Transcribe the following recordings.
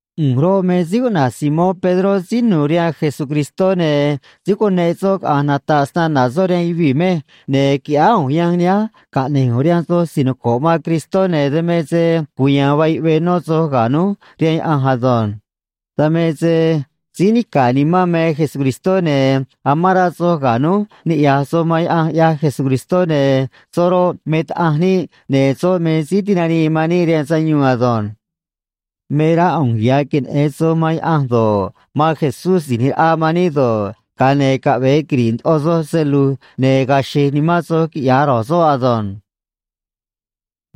ꞌU̱nj roꞌ, me síí cuꞌna̱j Simón Pedró, síí nu̱u̱ rihaan Jesucristó, ne̱ síí cuneꞌ soꞌ caꞌa̱nj nata̱ꞌ snana̱ soꞌ rihaan yuvii̱ mej, ne̱ qui̱ꞌyáá ꞌu̱nj yanj nihánj caꞌne̱j ꞌu̱nj rihaan soj si̱j noco̱ꞌ man Cristó, ne̱ dan me se cuya̱a̱n vaa yuꞌvee nó soj ga̱ núj rihaan Yaꞌanj ado̱nj. Dan me se síí nica̱ nimán me Jesucristó, ne̱ amán rá soj ga̱ núj niꞌya̱j soj man Yaꞌanj, ꞌyaj Jesucristó, ne̱ soꞌ roꞌ, me Taꞌanj níꞌ, ne̱ soꞌ me Síí Tinanii man níꞌ rihaan Sayuun ado̱nj. Me rá ꞌu̱nj ya̱ queneꞌe̱n soj man Yaꞌanj do̱ꞌ, man Jesús Si̱j ꞌNi̱j Raꞌa man níꞌ do̱ꞌ, ga̱a ne̱ caꞌve̱e quiri̱ꞌ ndoꞌo soj se lu̱j ne̱ ga̱a̱ xe̱j nimán soj, quiꞌya̱j ro̱j soꞌ ado̱nj.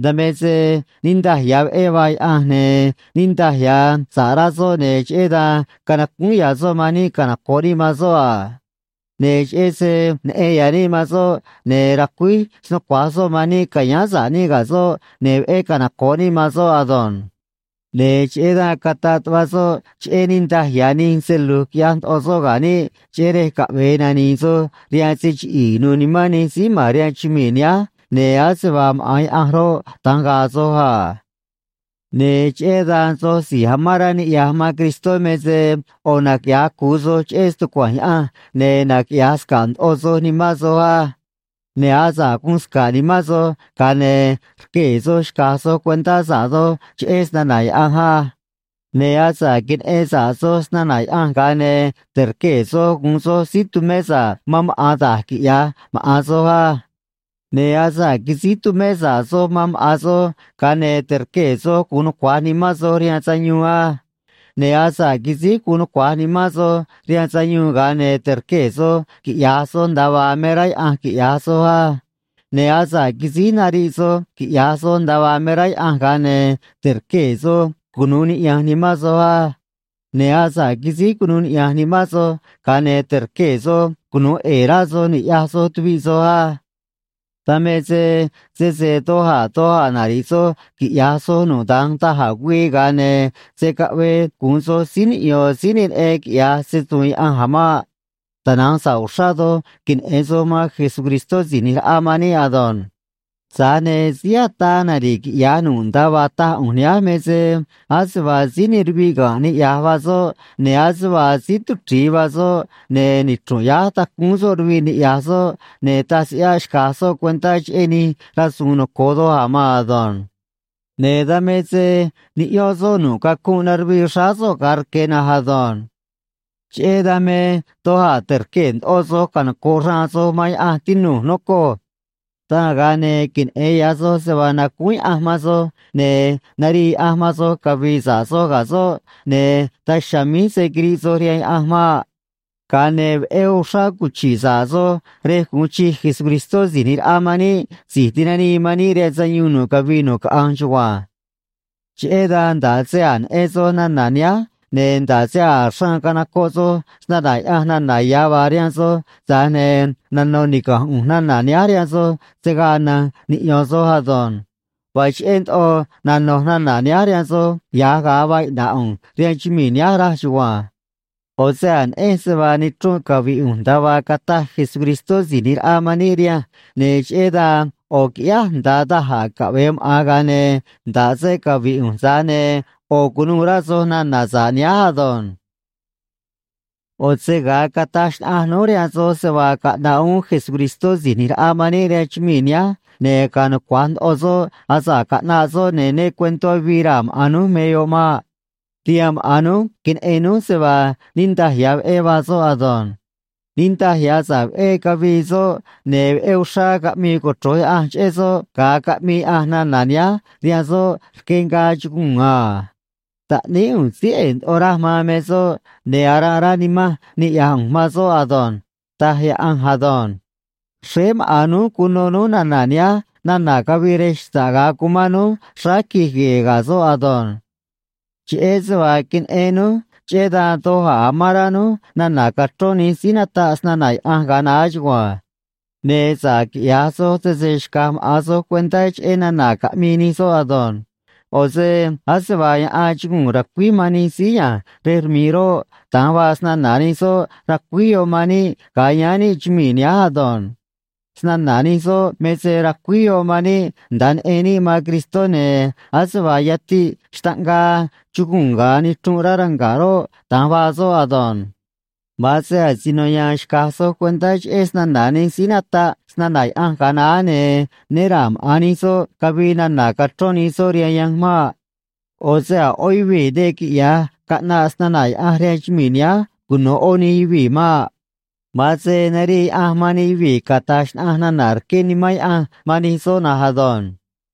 Dan me se niꞌndaj ya̱ veꞌé vaa Yaꞌanj ne̱ niꞌndaj ya̱ sa̱ꞌ rá soꞌ, ne̱ cheꞌé dan canacúún ya̱ soꞌ man níꞌ canoco̱ꞌ níꞌ man soꞌ a. Ne̱ cheꞌé se neꞌen ya̱ níꞌ man soꞌ, ne̱ racuíj snucua̱j soꞌ man níꞌ ca̱yáán sa̱ꞌ níꞌ ga̱ soꞌ, ne̱ veꞌé canoco̱ꞌ níꞌ man soꞌ ado̱nj. Ne̱ cheꞌé dan cataꞌ tuꞌva soꞌ cheꞌé niꞌndaj ya̱ nij se lu̱j quiꞌya̱j ndoꞌo soꞌ ga̱ níꞌ, cheꞌé rej caꞌve̱e nani̱i̱ soj rihaan se chiꞌi̱i̱ nu̱u̱ nimán nij síí ma̱n rihaan chumii̱ nihánj, ne̱ ase vaa maꞌa̱n Yaꞌanj roꞌ, da̱nj ga̱a̱ soj a. Ne̱ cheꞌé dan soj si̱j amán rá niꞌya̱j man Cristó me se ꞌo̱ naquiꞌya̱j cu̱u soj cheꞌé stucua̱nj Yaꞌanj, ne̱ naquiꞌya̱j sca̱ꞌ ndoꞌo soj nimán soj á. Ne̱ asa̱ꞌ guun sca̱ꞌ nimán soj, ga̱a ne̱ rquee̱ soj xca̱j soj cuentá sa̱ꞌ doj cheꞌé snana̱ Yaꞌanj á. Ne̱ asa̱ꞌ queneꞌen sa̱ꞌ soj snana̱ Yaꞌanj, ga̱a ne̱ te̱rquee̱ soj gu̱un soj síí tumé sa̱ꞌ man maꞌa̱n da̱j quiꞌya̱j maꞌa̱n soj á. Ne̱ asa̱ꞌ quisíj tumé sa̱ꞌ soj man maꞌa̱n soj, ga̱a ne̱ te̱rquee̱ soj gu̱un nucua̱j nimán soj rihaan sayuun á. Ne̱ asa̱ꞌ quisíj guun nucua̱j nimán soj rihaan sayuun, ga̱a ne̱ te̱rquee̱ soj quiꞌya̱j soj nda̱a vaa me rá Yaꞌanj quiꞌya̱j soj á. Ne̱ asa̱ꞌ quisíj nariꞌ soj quiꞌya̱j soj nda̱a vaa me rá Yaꞌanj, ga̱a ne̱ te̱rquee̱ soj cunu̱u niꞌya̱nj nimán soj á. Ne̱ asa̱ꞌ quisíj cunuu niꞌya̱nj nimán soj, ga̱a ne̱ te̱rquee̱ soj cunu̱u ꞌe̱e̱ rá soj ni̱ꞌyaj soj tuviꞌ soj á. Dan me se sese doj a̱ doj a̱ nari̱ꞌ soj quiꞌya̱j soj nu̱ꞌ da̱nj da̱j a̱ güii, ga̱a ne̱ se̱ caꞌvee gu̱un soj síí niꞌyo̱n síí ne neꞌen quiꞌya̱j se‑su̱u̱n Yaꞌanj a̱ maꞌ. Tana̱nj sa̱ꞌ uxrá doj queneꞌe̱n soj man Jesucristó Si̱j ꞌNi̱j Raꞌa man níꞌ ado̱nj. Tza̱j ne̱ síí ataa nari̱ꞌ quiꞌya̱j nu̱ꞌ nda̱a vaa taj ꞌu̱nj nihánj me se ase vaa síí ne ruviꞌ ga̱nꞌ niꞌya̱j vaa soꞌ, ne̱ ase vaa síí tuchri̱i vaa soꞌ, ne̱ nichru̱nꞌ yáj tacúún soꞌ ruviꞌ niꞌya̱j soꞌ, ne̱ taj se ꞌyáꞌ xca̱j soꞌ cuentá cheꞌé nij rasu̱u̱n noco̱o doj a̱ maan ado̱nj. Ne̱ dan me se niꞌyón soꞌ nu̱ꞌ cacunꞌ naruvii xráá soꞌ ga̱a rque̱ na̱nj ado̱nj. Cheꞌé dan me doj a̱ te̱rquee̱ ndoꞌo soj canoco̱ꞌ xraan soj man Yaꞌanj, tinu̱j, nocoj. Dan, ga̱a ne̱ queneꞌe̱n ya̱ soj se vaa nacúún Yaꞌanj man soj ne̱ narii Yaꞌanj man soj cavi̱i̱ sa̱ꞌ soj ga̱ soꞌ, ne̱ daj chiha̱a̱ míj se̱ quiriꞌ soj rihaan Yaꞌanj maꞌ. Ga̱a ne̱ veꞌé uxrá cuchi̱ꞌ sa̱ꞌ soj rej gu̱un chij Jesucristó Si̱j ꞌNi̱j Raꞌa man níꞌ, Si̱j Tinanii man níꞌ rihaan Sayuun, nu̱ꞌ cavii nu̱ꞌ caꞌanj chugua̱nj. Cheꞌé dan nda̱ꞌ se a̱j neꞌen soj nana̱ nihánj, ne̱ nda̱ꞌ se a̱j xraan canocoꞌ soj snana̱ Yaꞌanj nana̱ ya̱ vaa rihaan soj, tza̱j ne̱ nano̱ niga̱nj ꞌu̱nj nana̱ nihánj rihaan soj se̱ gaa na̱nj niꞌyo̱n soj ado̱nj. Vaa cheꞌé ndoꞌo nano̱j nana̱ nihánj rihaan soj ya̱j ga̱a vaa iꞌna̱ꞌ ꞌu̱nj rihaan chumii̱ nihánj, raj chugua̱nj. ꞌO̱ se a̱j neꞌenj se vaa nichrunꞌ cavi̱ꞌ ꞌu̱nj, nda̱a vaa cataj Jesucristó Si̱j ꞌNi̱j Raꞌa man níꞌ rihanj, ne̱ cheꞌé dan ꞌo̱ qui̱ꞌyáj nda̱a da̱j a̱ caꞌve̱e maꞌa̱n, ga̱a ne̱ nda̱ꞌ se cavi̱ꞌ ꞌu̱nj, tza̱j ne̱ ꞌo̱ cu̱nuû rá soj nana̱ sa̱ꞌ nihánj ado̱nj. ꞌO̱ se ga̱a cataj xnaꞌanj núj rihaan soj se vaa caꞌna̱ꞌ uún Jesucristó Si̱j ꞌNi̱j Raꞌa man níꞌ rihaan chumii̱ nihánj ne̱ ga̱a̱ nucua̱j ndoꞌo soꞌ asa̱ꞌ caꞌnaꞌ soꞌ, ne̱ né cue̱ntó avii raa̱ maꞌa̱n núj me yoꞌ maꞌ. Rihaan maꞌa̱n núj queneꞌen núj se vaa niꞌndaj ya̱ veꞌé vaa soꞌ ado̱nj. Niꞌndaj ya̱ sa̱ꞌ veꞌé cavii soꞌ ne̱ veꞌé uxrá caꞌmii cochro̱j Yaꞌanj cheꞌé soꞌ, ga̱a caꞌmii Yaꞌanj nana̱ nihánj rihaan soꞌ rque ngaa chuguu̱n a: “Taꞌníí ꞌu̱nj síí ꞌe̱e̱ ndoꞌo raj man me soꞌ, ne̱ aranꞌ rá nimanj niꞌya̱j ꞌu̱nj man soꞌ ado̱nj”, taj Yaꞌanj ado̱nj. Xréé maꞌa̱n núj cuno núj nana̱ nihánj nana̱ cavii rej xta̱ꞌ ga̱a cumán núj xráá quij gue̱e̱ ga̱ soꞌ ado̱nj. Cheꞌé se vaa queneꞌen núj, cheꞌé dan doj a̱ amán rá núj nana̱ cachrón nij síí nataꞌ snana̱ Yaꞌanj ga̱a naá chugua̱nj. Ne̱ sa̱ꞌ quiꞌya̱j soj, sese xca̱j maꞌa̱n soj cuentá cheꞌé nana̱ caꞌmii nij soꞌ ado̱nj. ꞌO̱ se ase vaa yaꞌan chuguu̱n racuíj man nij síí ya̱nj rej rmi̱ꞌ roꞌ, da̱nj vaa snana̱ nij soꞌ, racuíj yoꞌ man níꞌ ga̱a yáán níꞌ chumii̱ nihánj ado̱nj. Snana̱ nij soꞌ me se racuíj yoꞌ man níꞌ nda̱a neꞌen níꞌ man Cristó, ne̱ ase vaa yatiꞌ xtaꞌngaa chuguu̱n ga̱a nichrunꞌ rá ranga̱ꞌ roꞌ, da̱nj vaa soꞌ ado̱nj. Ma̱an se asino ya̱a̱n xca̱j soj cuentá cheꞌé snana̱ nij síí nataꞌ snana̱ Yaꞌanj ga̱a naá, ne̱ né ra̱a̱ maꞌa̱n nij soꞌ cavii nana̱ cachrón nij soꞌ rihaan yanj maꞌ. ꞌO̱ se a̱ ꞌó yuvii̱ ne quiꞌya̱j caꞌnaꞌ snana̱ Yaꞌanj rihaan chumii̱ nihánj cuno̱ ꞌó nij yuvii̱ maꞌ. Ma̱an se narii Yaꞌanj man nij yuvii̱ cata̱j xnaꞌanj nana̱ rqué Nimán Yaꞌanj man nij soꞌ na̱nj ado̱nj.